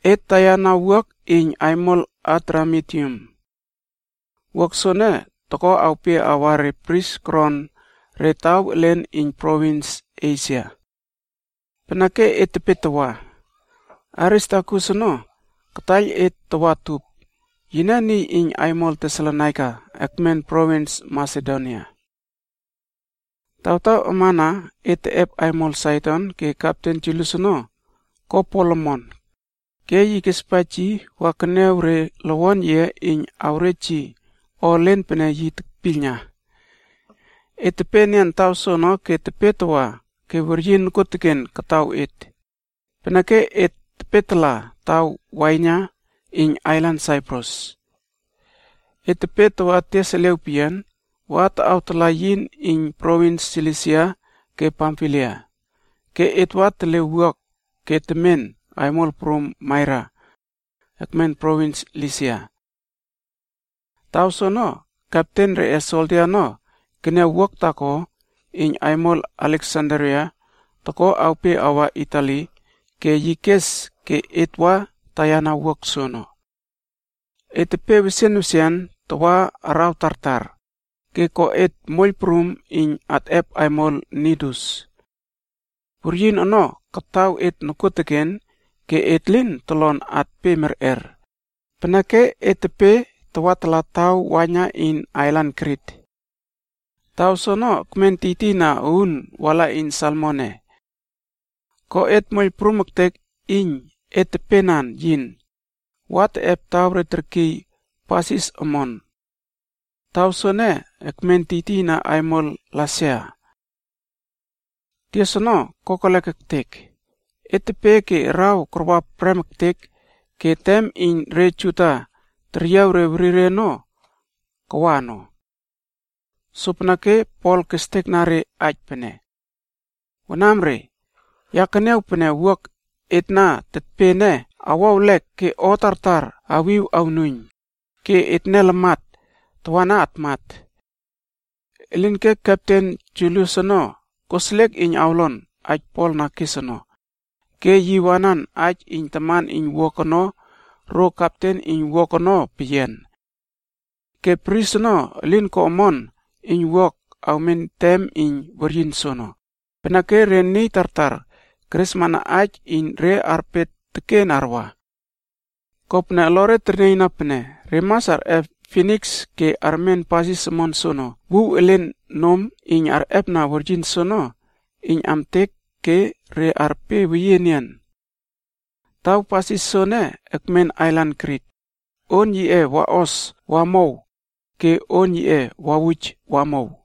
Et taiyana wuak aimol iyn aimol Adramitium. Wuak aimol ene toko awpe awa re bris koron re taw elen iyn provins Esia ono. Peneke et tepe tawa ke Aristarkus ono taiyltaiyl et tawa utup. Yine niy iyn aimol Tesalonaika ekmen provins Masedonia. Tawtaw amana et teꞌep aimol Saidon ke kepten Julius ono ko Pol omon ke yi kespaij yi wa keniaw re lowon yiꞌe iyn awrej yi o elen pene yi tekpiylna. Et tepe enian taw soono ke tepe tawa ke weryin nokuoteken kataw et, peneke et tepetala taw waiyna iyn ailan Saiprus. Et tepe tawa tias eliaw peyian wa taꞌawtala yin iyn provins Silisia ke Pamfilia, ke et wa tele wuak ke temen aimol prum Maira, ekmen provins Lisia. Taw soono kepten reꞌe soldia ono keniaw wuak aimol taako iyn aimol Aleksandria ono toko awpe awa Itali ke yi kes ke et wa taiyana wuak aimol soono. Et tepe wesian wesian tawa araw tartar, ke ko et moiyl prum iyn atꞌep aimol Nidus. Weryin ono kataw et nokuoteken ke et lin tolon atpe merꞌer, peneke et tepe tawatala taw waiyna iyn ailan Krit. Taw soono ekmen tiytiyna uun wala iyn Salmone. Ko et moiyl prum ektek iyn et tepenan yin, wa teꞌep taw re terkiy Pasis Omon. Taw soene ekmen tiytiyna aimol Lasea. Tias ono kokelek ektek, et tepe ke araw karwa prem ektek ke tem iyn re Juda teryiaw re werireb ono, kawa ono. Sopeneke Pol kestekna re aij pene, “Wanamre, ya keniaw pene wuak aimol et na tetpe ene awo ewlek ke o tartar awiw awnuiyn ke etne lamat tawana atmat.” Elinke kepten Julius ono koseliek iyn awlon aij Pol na kes ono, ke yi wanan aij iyn taman iyn wuak aimol ono ro kepten iyn wuak aimol ono peyian. Ke bris ono elin ko omon iyn wuak aimol ene awmen tem iyn weryin soono, peneke re niy tartar keresmana aij iyn re arpe teken arwa. Kopene olore ternieiyna pene re mas arꞌep Finiks ke armen pasis omon soono wuw elen nom iyn arꞌepna weryin soono iyn amtek ke re arpe weyiema enian. Taw pasis soene ekmen ailan Krit, on yiꞌe waꞌos wamow ke on yiꞌe wawuj wamow.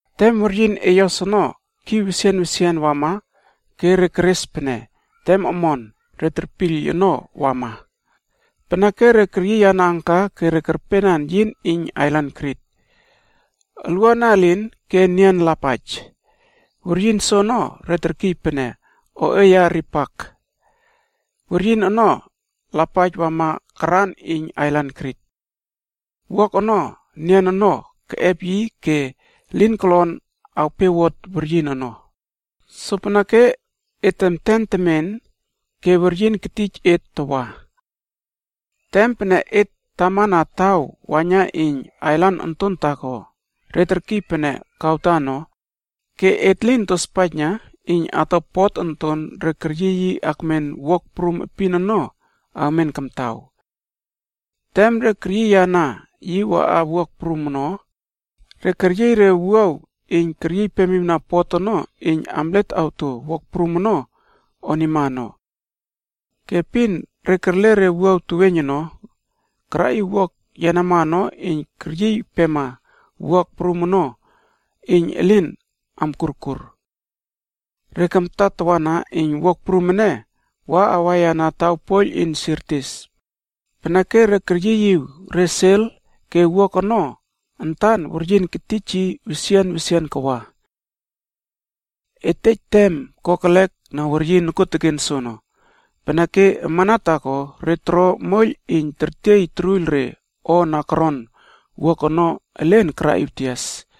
Tem weryin eyos ono kiw wesian wesian wama ke re keres pene tem omon re terpiyl ono wama, peneke re keryiyana anka ke re kerpenan yin iyn ailan Krit. Olwuana elin ke nian lapaij, weryin soono re terkiy pene “Oꞌeya ripak” weryin ono lapaij wama karan iyn ailan Krit. Wuak aimol ene nian ono keꞌep yi ke lin kolon awpewot weryin ono, sopeneke et temten temen ke weryin ketij et tawa. Tem pene et tamana taw waiyna iyn ailan onton taako re terkiy pene Kauda ono, ke et lin tospaijna iyn ato pinas onton re keryiy yi akmen wuak prum epin ono awmen kamtaw. Tem re keryiyana yi waꞌana wuak prum ono, re keryiy re wuaw iyn keryiypemiwna pinas onton ono iyn amlet oto wuak aimol ono onima ono. Ke epin re kerle re wuaw teweiyn ono karaꞌiw wuak aimol ene yenama ono iyn keryiypema wuak aimol ono iyn elin amkurkur. Re kamta tawana iyn wuak aimol ene wa awaiyana taw poiyl iyn Sirtis ono, peneke re keryiyiw re nuiyn ono ke wuak aimol ene antan weryin ketij yi wesian wesian kawa. Et tej tem kokelek na weryin nokuoteken soono, peneke amana taako re toro moiyl iyn tertiey toruiyl re o na koron wuak aimol ono elen karaꞌiw tias.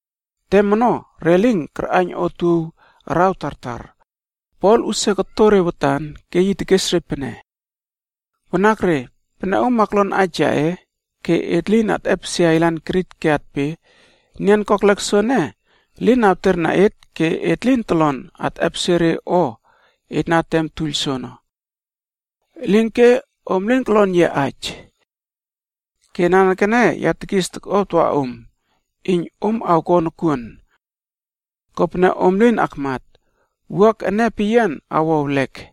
Tem ono, re lin karꞌaiyn otuow araw tartar, Pol usia koto re watan ke yi tekes re pene, “Wanakre, pene om aklon aij yaꞌe ke et lin atꞌepesie ailan Krit ke atpe, nian kokelek soene elin awterna et ke et lin tolon atꞌepesie re o et na temtuiyl soono. Elinke, om lin kolon yia aij. Ke nanekene ya tekis tokꞌuaw tawa om, iyn om awko nokuon. Kopene om elin akmat, wuak aimol ene peyian awo ewlek.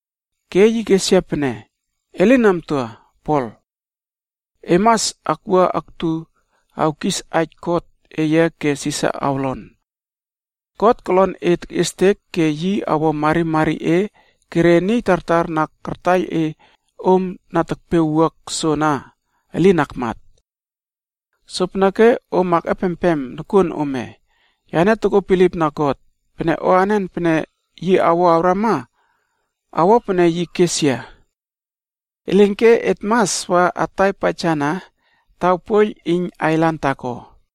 Ke yi kes yia pene, ‘E lin amtua, Pol. E mas akwua aktu awkis aij kot eye ke Sisar awlon. God kolon e tekꞌiestek ke yi awo marimari e ke re niy tartar na kartaiyl e om na tekpe wuak aimol soana elin armat.’ Sopeneke om akꞌepempem nokuon ome, yane tokuo bilipna God pene o anen pene yi awo awrama, awo pene yi kes yia. Elinke, et mas wa atai paijana taw poiyl iyn ailan taako.”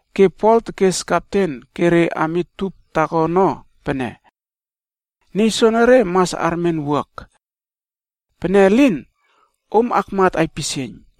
Ke Pol tekes ke re ami tup taako ono pene, “Niy soenere mas armen wuak aimol ene. Pene elin, om akmat aipisieiyn.”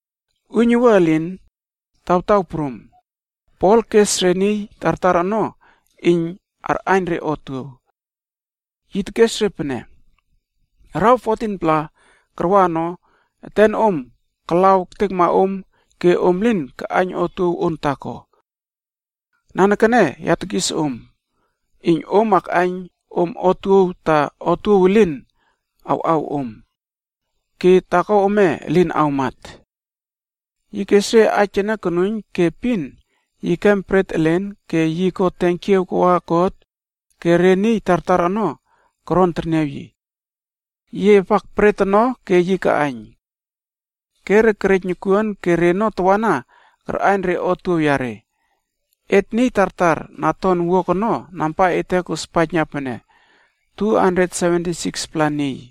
Uiynuwua elin tawtaw prum, Pol kes empema re niy tartar ono iyn arꞌaiyn re otuow. Yi tekes re pene, “Araw 14-pla karwa ono etenom kalaw ektekma om ke om lin kaꞌaiyn otuow on taako. Nanekene ya tekis empema om iyn om akꞌaiyn om otuow ta otuow elin awꞌaw om. Ke taako ome elin awmat.” Yi kes re aij ene konuiyn ke epin yi kem bret elen ke yi ko tenkiaw kawa God ke re niy tartar ono koron terniaw yi. Yi epak bret ono ke yi kaꞌaiyn. Ke re kerej nokuon ke reno tawana karꞌaiyn re otuow yare. Et niy tartar na ton wuak aimol ono namba ete kospaijna 276-pla et niy.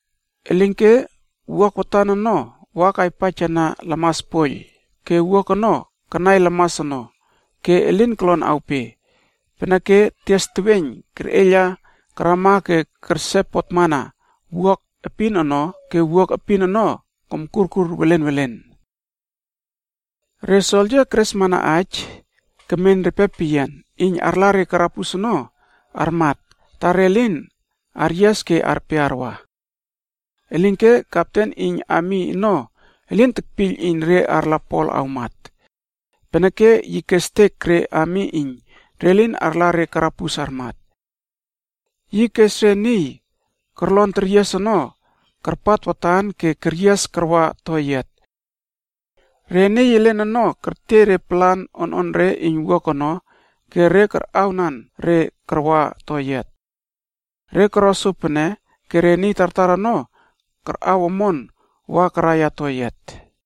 Elinke wuak aimol watan ono wa kaiypaijana lamas poiyl ke wuak aimol watan ono kanai lamas ono ke elin kolon awpe. Sopeneke tem tias teweiyn kerꞌeiyla karama ke kerse potmana wuak aimol epin ono ke epin iyn wuak aimol ono komkurkur welen welen. Re soldia keresmana aij kemen repe peyian iyn arla re karabus ono armat ta re lin aryias ke arpe arwa. Elinke kepten iyn ami ono elin tekpiyl iyn re arla Pol awmat, peneke yi kestek re ami iyn re lin arla re karabus armat. Yi kes re niy korlon teryias ono karpat watan ke keryias karwa toyiat. Re niy elen ono kertiey re palan ononre iyn wuak aimol ono ke korontawa wa karaiya toyiat. Re koro sopene ke re niy tartar ono karꞌaw omon wa karaiya toyiat.